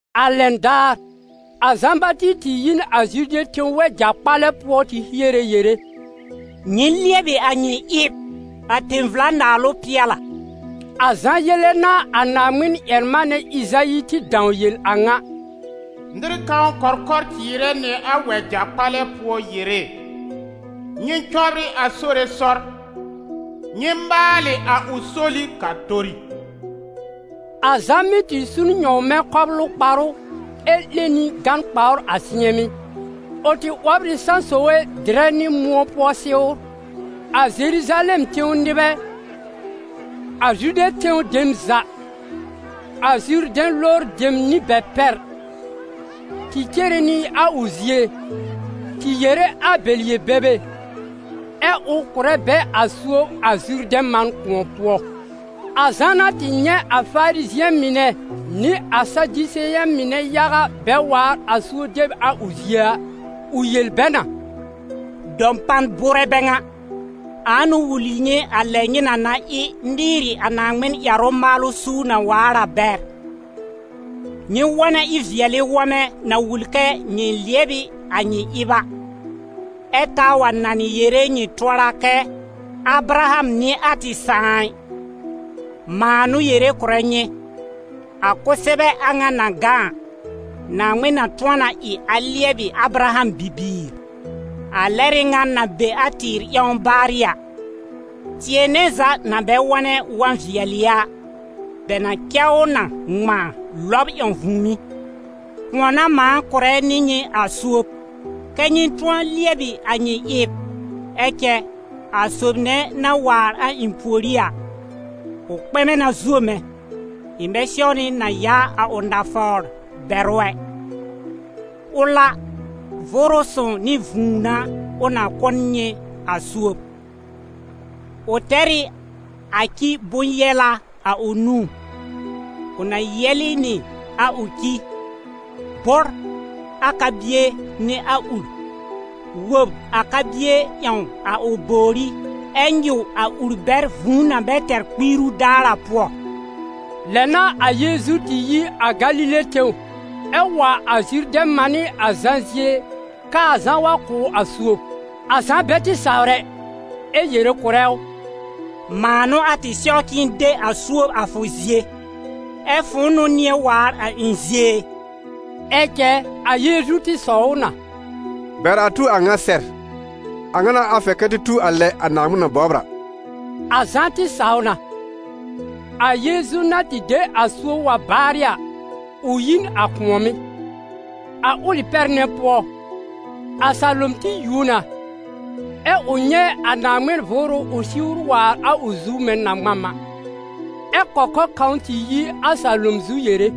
A lɛn daar, a Zã-Bati tɩ yi n a Zude tẽw wɛja-kpalɛ pʋɔ tɩ hiere yere: «Nyɩ lɩɛbɩ a nyɩ ɩb, a tẽ-vla-naalʋ pɩɛl a.» A Zã yele n'a a Naaŋmɩn-ƴɛr-manɛ Ɩzayi tɩ dãw yel a ŋa: «Nɩr kãw kɔkɔr cɩɩrɛ nɩ a wɛja-kpalɛ pʋɔ yere: ‹Nyɩ cɔbrɩ a Sore sɔr, nyɩ maalɩ a ʋ soli k'a tori.›» A Zã mɩ́ tɩ su n nyɔ̃wmɛ̃ kɔblʋ kparʋ ɛ 'lẽ nɩ gán-kpawr a sɩ̃ɛmɩ́; ʋ tɩ 'wɔbr ɩ sãsoge dɩrɛ nɩ mʋ̃ɔ pʋɔ sɩwr. A Zeruzalɛm tẽw nɩbɛ, a Zude tẽw dem za, a Zurdɛ̃ lowr dem nɩ bɛ pɛr, tɩ cere nɩ a ʋ zie, tɩ yere a bɛ yel-bebe, ɛ ʋ kʋ̀rɛ bɛ a suob a Zurdɛ̃ man kʋ̃ɔ pʋɔ. A Zã na tɩ nyɛ̃ a Farizɩ̃ɛ mɩnɛ nɩ a Sadiseyɛ̃ mɩnɛ yaga bɛ waar a suob deb a ʋ zie a, ʋ yel bɛ na: «Dɔpan bʋʋrɛ bɛ ŋa! Ãa n'ʋ wul nyɩ a lɛ nyɩ na na ɩ nɩɩrɩ a Naaŋmɩn ƴɛrʋ-maalʋ suur na waar a bɛr? Nyɩ wɔnɛ ɩ-vɩɛlɩ wɔmɛ na wul kɛ nyɩ lɩɛb ɩ a nyɩ ɩb a, ɛ taa wa nanɩ yere nyɩ tʋɔra kɛ: ‹ Abraham n'ɩ a tɩ sãà ɩ.› Mãa n'ʋ yere kʋ̀rɛ nyɩ, a kʋsɛbɛ a ŋa na gã a, Naaŋmɩn na tʋ̃ɔ na ɩ a lɩɛbɩ Abraham bibiir. A lɛr ɩ ŋan na be a tɩɩr ƴãw baarɩ a, tɩɛ nɛ za na bɛ wɔnɛ wɔ̃-vɩɛlɩ a, bɛ na cɛ ʋ na ŋmãa lɔb ƴãw vũùmí. Kʋ̃ɔ n'a mãa kʋ̀rɛ nɩ nyɩ a suob, kɛ́ nyɩ tʋ̃ɔ lɩɛbɩ a nyɩ ɩb, ɛ cɛ a sob nɛ na waar a ɩ̃ pùorí a, ʋ kpɛmɛ na zuo mɛ̃, ɩ̃ bɛ sɛwnɩ na yaa a ʋ nafawr bɛr ʋ ɛ. Ʋl a, Vʋʋrʋ Sõw nɩ vũu n'a ʋ na kʋ̀ n nyɩ a suob. Ʋ tɛr ɩ a ci bʋ̃-yɛla a ʋ nũú, ʋ na yɛ́lɩ́ nɩ a ʋ ci, bʋ́r a ka-bie nɩ a ur, wob a ka-bie ƴãw a ʋ bòwrí ɛ nyɩw a ur bɛr vũu na bɛ tɛr kpiiru daar a pʋɔ.» Lɛ n'a a Yeezu tɩ yi a Galile tẽw, ɛ wa a Zurdɛ̃ mànɩ́ a Zã zie k'aa Zã wa kʋ̀ ʋ a suob. A Zã bɛ tɩ sawr ɛ, ɛ yere kʋ̀rɛ ʋ: «Mãa n'ʋ a tɩ sɛw k'ɩ̃ɩ de a suob a fʋ zie, ɛ fʋ̃ʋ n'ʋ nɩ̃ɛ waar a ɩ̃ zie e!» Ɛ cɛ, a Yeezu tɩ sɔw ʋ na: «Bɛr a tu a a ŋa sɛr. A ŋa n'a a fɛr kɛ tɩ tu a lɛ a Naaŋmɩn na bɔbr a.» A Zã tɩ saw na. A Yeezu na tɩ de a suob wa baarɩ a, ʋ yi n a kʋ̃ɔ̀mɩ́. A ʋlɩ pɛr nɛ pʋɔ, a salom tɩ yuo na, ɛ ʋ nyɛ̃ a Naaŋmɩn Vʋʋrʋ ʋ siwr waar a ʋ zu mɛ̃ na-ŋmam a, ɛ́ kɔkɔr kãw tɩ yi a salom zu yere: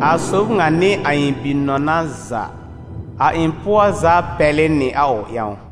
«A sob ŋa n'ɩ a ɩ̃ Bi-nɔna za, a ɩ̃ pʋɔ za pɛlɩ nɩ a ʋ ƴãw.»